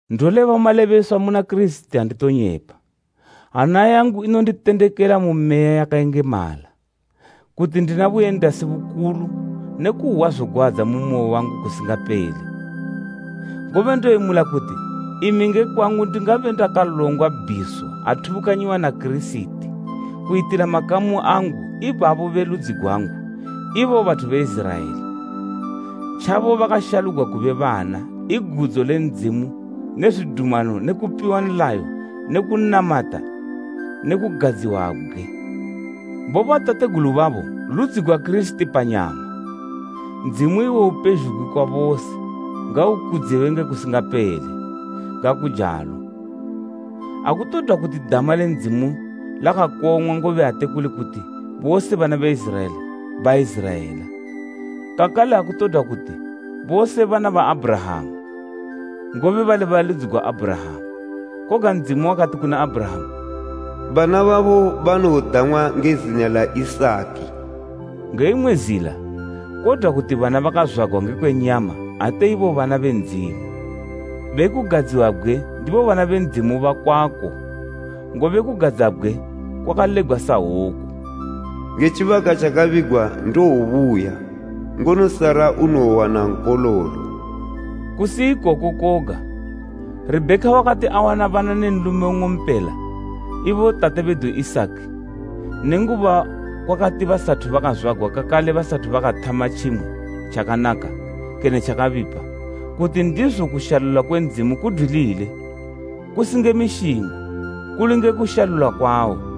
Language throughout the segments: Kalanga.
Ndoleba malebeswa muna Kirisiti, anditonyepa. Hana yangu inonditendekela mu Meya yakayengemala, kuti ndina buyendasi bukulu ne kuhwa zogwadza mu moyo wangu kusingapele. Ngobe ndoyemula kuti imi nge kwangu ndingabe ndakalongwa bhiso athubukanyiwa na Kirisiti kuyitila makamu angu, ibabo be ludzi gwangu ibo bathu be Iziraela. Tjabo bakashalugwa kube bana, i gudzo le Ndzimu ne zwidumano ne kupiwa nlayo ne kunamata ne kugadziwabgwe. Bobatategulu babo ludzi gwa Kirisiti panyama, Ndzimu iwo upezhugwi kwa bose, ngaukudziwe nge kusingapele! Ngakujalo. Akutodwa kuti dama le Ndzimu lakakong'wa, ngobe ate kuli kuti bose bana be Iziraela, Baiziraela. Kakale akutodwa kuti bose bana ba Abhurahama, ngobe bali be ludzi gwa Abhurahama. Koga Ndzimu wakati kuna Abhurahama, “Bana babo banowodang'wa nge zina la Isaki.” Nge imwe zila kodwa kuti bana bakazwagwa ngekwe nyama ate ibo bana be Ndzimu, be kugadziwabgwe ndibo bana be Ndzimu bakwako; ngobe kugadzabgwe kwakalebgwa sahwoku, “Nge tjibaka tjakabigwa ndowobuya ngono Sara unowowana nkololo.” Kusi ikoko koga, Rebheka wakati awana bana ne nlume nng'ompela, ibo tate bedu Isaki, nenguba kwakati basathu bakazwagwa kakale basathu bakathama tjimwe tjakanaka kene tjakabipa, kuti ndizo kushalula kwe Ndzimu kudwilile, kusi nge mishingo, kuli nge kushalula kwawo,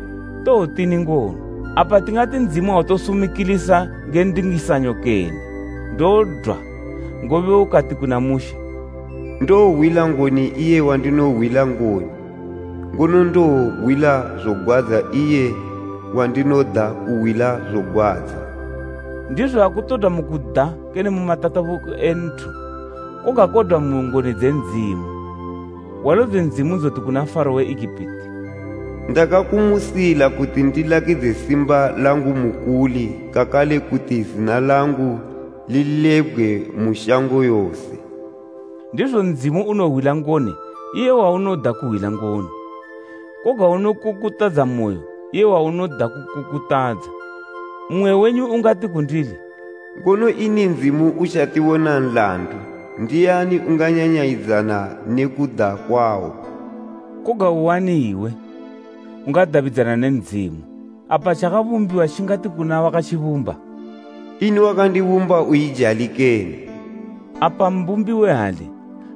Towotini ngono? Apa tingati Ndzimu autosumikilisa nge ndingisanyo kene? Ndodwa! Ngobe ukati kuna Mushe, “Ndowohwila ngoni iye wandinohwila ngoni, ngono ndowohwila zogwadza iye wandinoda kuhwila zogwadza.” Ndizo akutodwa mu kuda kene mu matatabuko e nthu koga kodwa mu ngoni dze Ndzimu. Hwalo dze Ndzimu dzoti kuna Faro we Egipiti, “Ndakamusila ikoku, kuti ndilakidze simba langu mukuli kakale kuti zina langu lilebgwe mu shango yose.” Ndizo Ndzimu unohwila ngoni iye waunoda kuhwila ngoni, koga unokukutadza moyo iye waunoda kukukutadza. Mmwe wenyu ungati kundili, “Ngono ini Ndzimu utjatibona nlandu? Ndiani unganyanyayidzana ne kuda kwawo?” Koga uani iwe ungadabidzana ne Ndzimu? Apa tjakabumbiwa tjingati kuna wakatjibumba, “Ini wakandibumba uijali kene?” Apa mbumbi we hali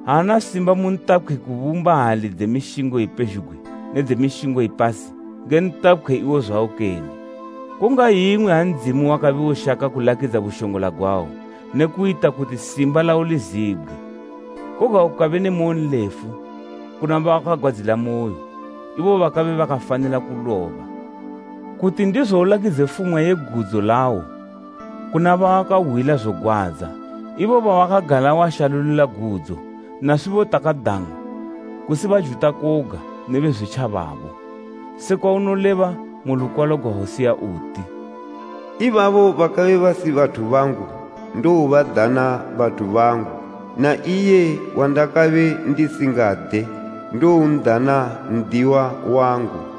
aana simba mu ntapkhwi kubumba hali dze mishingo ipezhugwi ne dze mishingo ipasi nge ntapkhwi iwo zwawo kene? Kungayingwi ha Ndzimu wakabe ushaka kulakidza bushongola gwawo ne kuyita kuti simba lawo lizibgwe, koga ukabe ne moyonlefu kuna bawakagwadzilamoyo, ibo bakabe bakafanila kuloba, kuti ndizo ulakidze fumwa ye gudzo lawo kuna bawakahwila zogwadza ibo bawakagala washalulila gudzo, naswibo takadang'wa, kusi Bajuta koga, ne Bezwitjababo. Sekwa unoleba mu lukwalo gwa Hosea uti, “Ibabo bakabe basi bathu bangu, ndowobadana ‘Bathu bangu,’ na iye wandakabe ndisingade, ndowon'dana ‘N'diwa wangu.’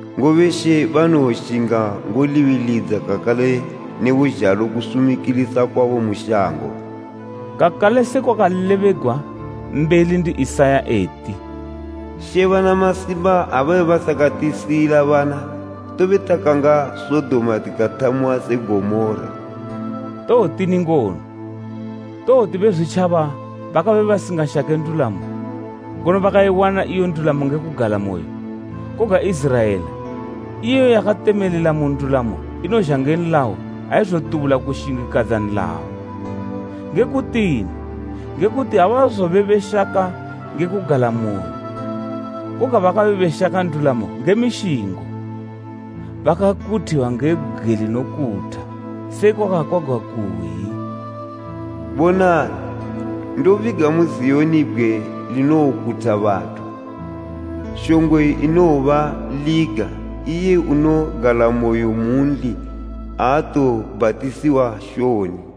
Ngobe She banowoshinga ngolibilidza kakale ne buzhalo kusumikilisa kwabo mu shango.” Kakale se kwakalebegwa mbeli ndi Isaya eti, “She bana masimba ha babe basakatisiyila bana, tobe takanga Sodoma, tikathamiwa se Gomora.” Towotini ngono? Towoti Bezwitjaba bakabe basingashake ndulamo, ngono bakayiwana iyo ndulamo nge kugalamoyo, koga Iziraela, iyo yakatemelela mu ndulamo inozha nge nlayo aizotubula kushingikadza nlayo. Nge kutini? Nge kuti abazobe beshaka nge kugalamoyo, koga bakabe beshaka ndulamo nge mishingo. Bakakuthiwa nge bgwe linokutha, sekwa kwakakwagwa kuyi, “Bonani, ndobiga mu Ziyoni bgwe linowokutha bathu, shongwe inowobaliga, iye unogalamoyo munli aatowobhatisiwa shoni.”